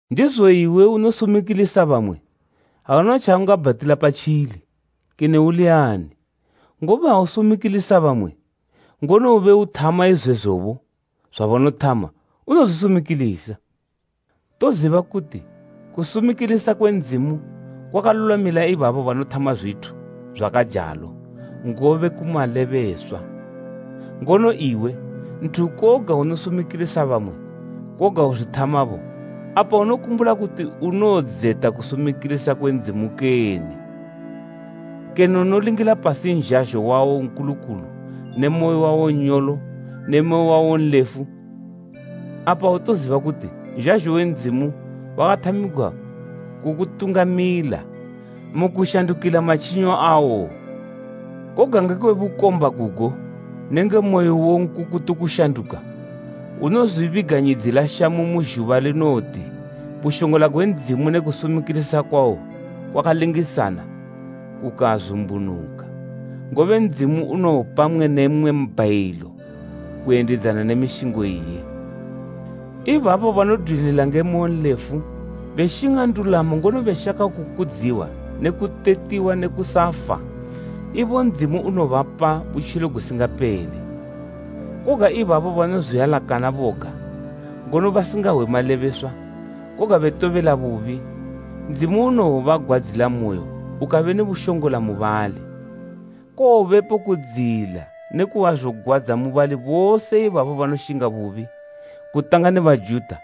Ndizo iwe unosumikilisa bamwe, auna tjaungabhatila patjili, kene uli ani; ngobe ha usumikilisa bamwe, ngono ube uthama izwezobo zwabanothama unozwisumikilisa. Toziba kuti kusumikilisa kwe Ndzimu kwakalulwamila ibabo banothama zwithu zwakajalo ngobe ku malebeswa. Ngono iwe, nthu koga unosumikilisa bamwe koga uzwithamabo. Apa unokumbula kuti unowodzeta kusumikilisa kwe Ndzimu kene? Kene unolingila pasi nzhazho wawo nkulukulu ne moyo wawo nyolo ne moyo wawo nlefu? Apa autoziba kuti nzhazho we Ndzimu wakathamigwa kukutungamilila mu kushandukila matjinyo awo? Koga ngekwe bukomba gugo nenge moyo uwo nkukutu kushanduka, unozwibiganyidzila shamu mu zhuba linowoti bushongola gwe Ndzimu ne kusumikilisa kwawo kwakalingisana kukazumbunuka. Ngobe Ndzimu unowopa mmwe ne mmwe mbhayilo kuyendidzana ne mishingo iye. Ibabo banodwilila nge moyonlefu beshinga ndulamo ngono beshaka kukudziwa ne kutetiwa ne kusafa, ibo Ndzimu unowobapa butjilo gusingapele. Koga ibabo banozwialakana boga, ngono basingahwe malebeswa, koga betobela bubi, Ndzimu unowobagwadzilamoyo ukabe ne bushongola mu bali. Kowobepo kudziyila ne kuhwazogwadza mu bali bose ibabo banoshinga bubi, kutanga ne Bajuta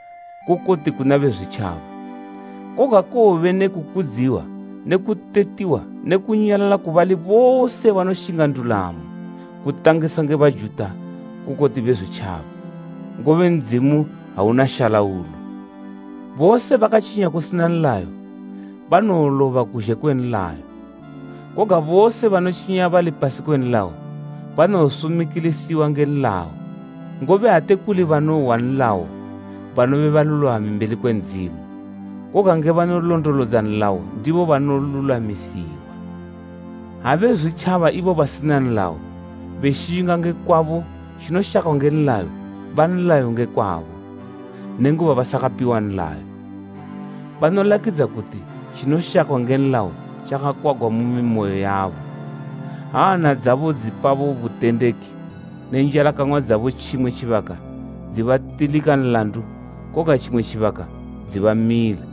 kukoti kuna Bezwitjaba. Koga kowobe ne kukudziwa ne kutetiwa ne kunyalala ku bali bose banoshinga ndulamo, kutangisa nge Bajuta kukoti Bezwitjaba, ngobe Ndzimu auna shalaulo. Bose bakatjinya kusina nlayo, banowoloba kuzhe kwe nlayo, koga bose banotjinya bali pasi kwe nlayo banowosumikilisiwa nge nlayo. Ngobe ate kuli banohwa nlayo, banobe balulwami mbeli kwe Ndzimu, koga nge banolondolodza nlayo ndibo banolulwamisiwa. Ha Bezwitjaba ibo basina nlayo beshinga nge kwabo zwabo tjinoshakwa nge nlayo, ba nlayo nge kwabo, nenguba basakapiwa nlayo. Banolakidza kuti tjinoshakwa nge nlayo tjakakwagwa mu mimoyo yabo, ha hana dzabo dzipabo butendeki ne njalakang'wa dzabo tjimwe tjibaka dzibatilika nlandu koga tjimwe tjibaka dzibamila,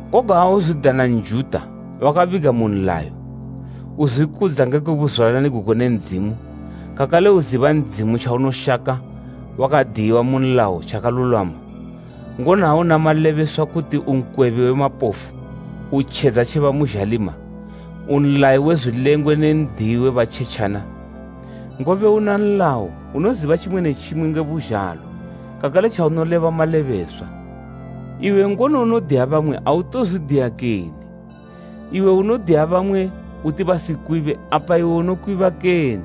Koga ha uzwidana Njuta wakabiga mu nlayo, uzwikudza ngekwe buzwalani gugo ne Ndzimu kakale uziba Ndzimu tjaunoshaka wakadiyiwa mu nlayo tjakalulwama, ngono ha una malebeswa kuti u nkwebi we mapofu, u tjedza tje bamu zhalima, u nlayi we zwilengwe ne n'diyi we batjetjana, ngobe una nlayo unoziba tjimwe ne tjimwe nge buzhalo kakale tjaunoleba malebeswa. Iwe ngono unodiya bamwe autozwidiya kene? Iwe unodiya bamwe uti basikwibe, apa iwe unokwiba kene?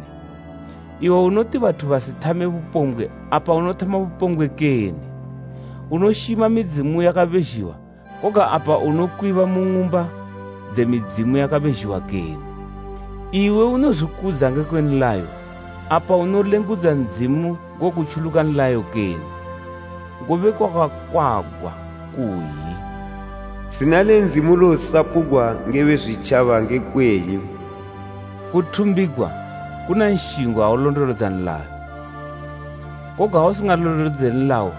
Iwe unoti bathu basithame bupombgwe, apa unothama bupombgwe kene? Unoshima midzimu yakabezhiwa, koga apa unokwiba mu ng'umba dze midzimu yakabezhiwa kene? Iwe unozwikudza ngekwe nlayo, apa unolengudza Ndzimu ngokutjuluka nlayo kene? Ngobe kwakakwagwa kuyi, “Zina le Ndzimu losapugwa nge Bezwitjaba nge kwenyu.” Kuthumbigwa kuna nshingo ha ulondolodza nlayo, koga ha usingalondolodze nlayo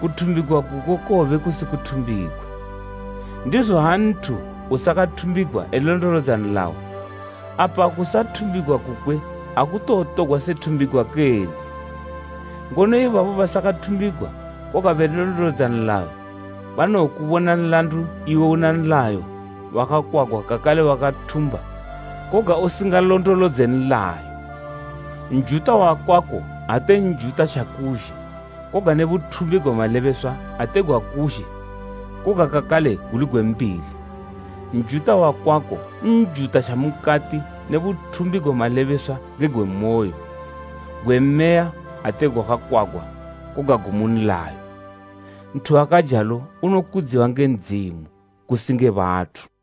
kuthumbigwa kuko kowobe kusi kuthumbigwa. Ndizo ha nthu usakathumbigwa elondolodza nlayo, apa kusathumbigwa kukwe akutowotogwa se thumbigwa kene? Ngono ibabo basakathumbigwa koga belondolodza nlayo banowokubona nlandu iwe una nlayo wakakwagwa kakale wakathumba koga usingalondolodze nlayo. Njuta wakwako ate Njuta tjakuzhe koga ne buthumbi gwe malebeswa ate gwakuzhe koga kakale guli gwe mbili. Njuta wakwako Njuta tja mukati ne buthumbi gwe malebeswa ngegwe moyo, gwe Meya ate gwakakwagwa koga mu nlayo. Nthu wakajalo unokudziwa nge Ndzimu, kusi nge bathu.